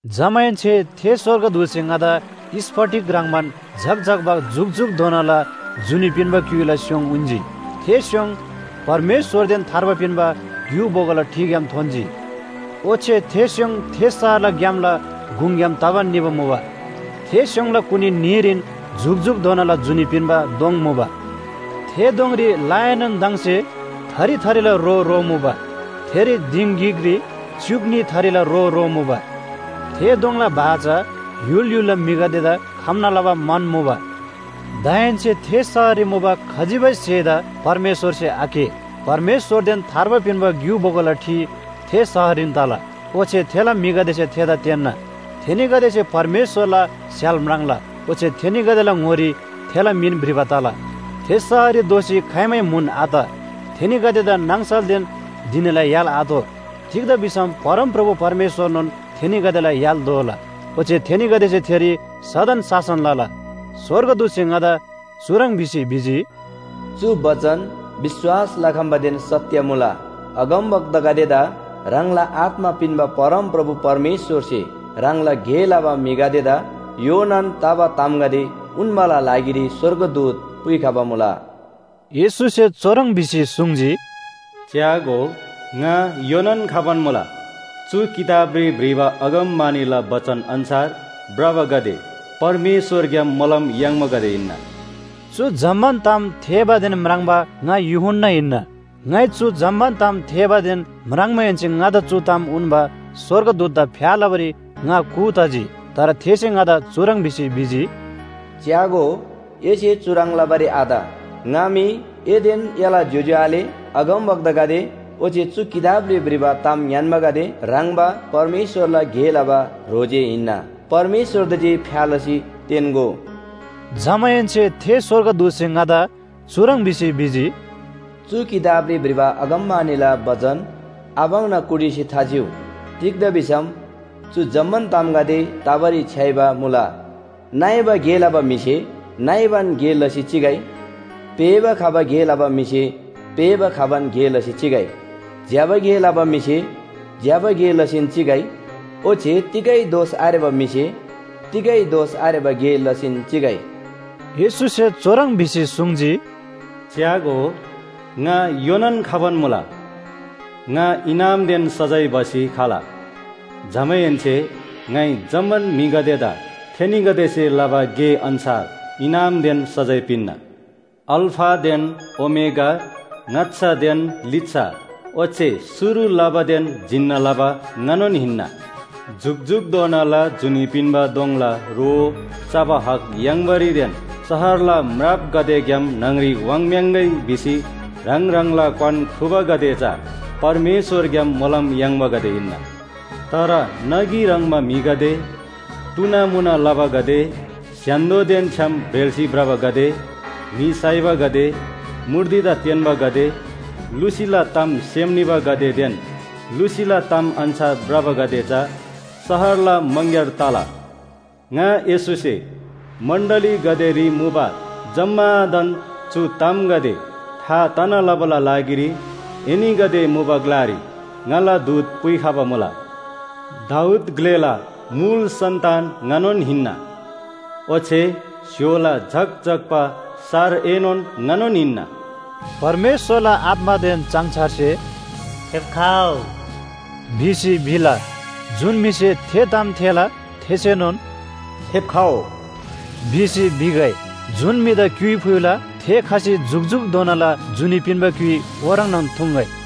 जमाहेन्‍से थे स्‍वर्गदूतसे ङादा स्‍फटिक ह्रङ्‌बान झक्‍झक्‍बा जुकजुकधोनाला जुनी पिन्‍बा क्‍युइला स्‍योङ उन्‍जी। थे स्‍योङ परमेश्‍वरदेन थार्बा पिन्‍बा ग्‍यु बोगोला ठिग्‍याम थोन्‍जी। ओच्‍छे थे स्‍योङ थे शहरला ग्‍यामला गुङग्‍याम तबान निबा मुबा। थे स्‍योङला कुनी न्‍हीरीन जुकजुकधोनाला जुनी पिन्‍बा दोङ मुबा। थे दोङरी लाएनोनदङसे थरी थरीला रो रोमुबा। थेरी दिङ गिकरी च्‍युक न्‍ही थरीला रो रोमुबा। थे दोङला भा चा य्‍हुल य्‍हुलला म्‍हिगदेदा खम्‍ना लबा मन मुबा। दाहेन्‍से थे शहररी मुबा खजिबै स्‍हेदा परमेश्‍वरसे आकेः। परमेश्‍वरदेन थार्बा पिन्‍बा ग्‍यु बोगोला ठि थे शहररीन तला, ओच्‍छे थेला म्‍हिगदेसे थेदा तेन्‍ना। थेनीगदेसे परमेश्‍वरला स्‍य्‍हाल म्राङ्ला, ओच्‍छे थेनीगदेला ङोरी थेला मिन भ्रिबा तला। थे शहररी दोःसी खाइमै म्‍हुन आत। थेनीगदेदा नाङसलदेन धिनीला य्‍हाल आतोः। तिग्‍दा भिसम परमप्रभु परमेश्‍वरनोन थेनीगदेला य्‍हाल दोला। ओच्‍छे थेनीगदेसे थेरी सदन शासन लला। स्‍वर्गदूतसे ङादा चुह्रङ् भिसी भिजी, “चु बचन विश्‍वास लखम्‍बादेन सत्‍य मुला। अगमवक्तागदेदा ह्राङला आत्‍मा पिन्‍बा परमप्रभु परमेश्‍वरसे ह्राङला गे लबा म्‍हिगदेदा योनान तबा तामगदे उन्‍बाला लागिरी स्‍वर्गदूत पुइखबा मुला।” येशूसे चुह्रङ् भिसी सुङ्जी, “च्‍यागो, ङा योनान खबान मुला! चु किताबरी भ्रिबा अगमवाणीला बचन अन्‍छार भ्रबागदे परमेश्‍वरग्‍याम मोलम याङ्बागदे हिन्‍ना।” चु जम्‍मान ताम थेःबादेन म्राङ्बा ङा यूहन्‍ना हिन्‍ना। ङाइ चु जम्‍मान ताम थेःबादेन म्राङ्माहेन्‍से ङादा चु ताम उन्‍बा स्‍वर्गदूतदा फ्‍या लबारी ङा कू तजी। तर थेसे ङादा चुह्रङ् भिसी भिजी, “च्‍यागो, एसे चुह्रङ् लबारी आत। ङा मी एदेन एला ज्‍योज्‍यो आले अगमवक्तागदे ओच्‍छे चु किताबरी भ्रिबा ताम ङ्‌यान्‍बागदे ह्रङ्‌बा परमेश्‍वरला गे लबा ह्रो जे हिन्‍ना। परमेश्‍वरदा जे फ्‍या लसी तेन्‍गो।” जमाहेन्‍से थे स्‍वर्गदूतसे ङादा चुह्रङ् भिसी भिजी, “चु किताबरी भ्रिबा अगमवाणीला बचन आपाङ्ना कुटिसी थाचिउ। तिग्‍दा भिसम चु जम्‍मान तामगदे तबारी छ्‌याइबा मुला। नइबा गे लबा म्‍हिसे नइबान गे लसी चिगै, पेःबा खबा गे लबा म्‍हिसे पेःबा खबान गे लसी चिगै, ज्‍यबा गे लबा म्‍हिसे ज्‍यबा गे लसीन चिगै, ओच्‍छे तिगै दोष आरेबा म्‍हिसे तिगै दोष आरेबा गे लसीन चिगै।” येशूसे चुह्रङ् भिसी सुङ्जी, “च्‍यागो, ङा योनान खबान मुला! ङा इनामदेन सजाय भसी खला। जमाहेन्‍से ङाइ जम्‍मान म्‍हिगदेदा थेनीगदेसे लबा गे अन्‍छार इनामदेन सजाय पिन्‍ना। अल्‍फादेन ओमेगा, ङाच्‍छादेन लिच्‍छा ओच्‍छे शुरु लबादेन जिन्‍ना लबा ङानोन हिन्‍ना। “जुकजुकधोनाला जुनी पिन्‍बा दोङला रो चबा हक याङ्‌बारीदेन शहरला म्रापगदेग्‍याम न्‍हङरी वाङ्‌म्‍याङ्‌गै भिसी ह्राङ ह्राङला क्‍वान ख्रुबागदे चा परमेश्‍वरग्‍याम मोलम याङ्बागदे हिन्‍ना। तर नगी ह्रङ्‌बा म्‍हिगदे, टुनामुना लबागदे, स्‍य्‍हान्‍दोदेन छ्‌याम ब्रेल्‍सी भ्रबागदे, म्‍हि साइबागदे, मूर्तिदा तेन्‍बागदे, लुसीला ताम सेम निबागदेदेन लुसीला ताम अन्‍छार भ्रबागदे चा शहरला मङग्‍यार तला। “ङा येशूसे मण्‍डलीगदेरी मुबा जम्‍मादान चु तामगदे था तना लबाला लागिरी एनीगदे मुबा ग्‍लारी ङाला दूत पुइखबा मुला। दाऊद ग्‍लेला मुल सन्‍तान ङानोन हिन्‍ना। ओच्‍छे स्‍य्‍होला झक्‍झक्‍बा सारएनोन ङानोन हिन्‍ना।” परमेश्‍वरला आत्‍मादेन चाङछारसे “फेप्‍खउ” भिसी भिला। जुन म्‍हिसे थे ताम थेःला थेसेनोन “फेप्‍खउ” भिसी भिगै। जुन म्‍हिदा क्‍युइ फुइला थे खसी जुकजुकधोनाला जुनी पिन्‍बा क्‍युइ ओह्रङ्नोन थुङ्‌गै।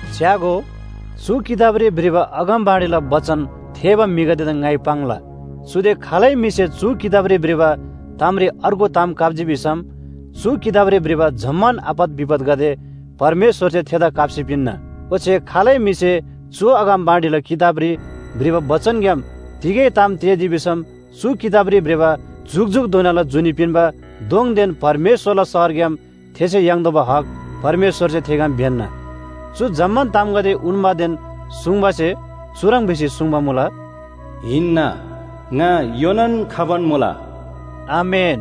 च्‍यागो, चु किताबरी भ्रिबा अगमवाणीला बचन थेःबा म्‍हिगदेदा ङाइ पाङ्ला। चुदे खालै म्‍हिसे चु किताबरी भ्रिबा तामरी अर्गु ताम काप्‍जी भिसम चु किताबरी भ्रिबा जम्‍मान आपत विपतगदे परमेश्‍वरसे थेदा काप्‍सी पिन्‍ना। ओच्‍छे खालै म्‍हिसे चु अगमवाणीला किताबरी भ्रिबा बचनग्‍याम तिगै ताम तेःजी भिसम चु किताबरी भ्रिबा जुकजुकधोनाला जुनी पिन्‍बा दोङदेन परमेश्‍वरला शहरग्‍याम थेसे याङ्तोःबा हक परमेश्‍वरसे थेग्‍याम ब्‍यन्‍ना। चु जम्‍मान तामगदे उन्‍बादेन सुङ्‌बासे चुह्रङ् भिसी सुङ्बा मुला, “हिन्‍ना, ङा योनान खबान मुला।” आमेन,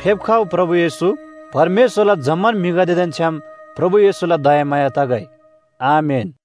फेप्‍खउ, प्रभु येशू। परमेश्‍वरला जम्‍मान म्‍हिगदेदेन छ्‌याम प्रभु येशूला दयामाया तगै। आमेन।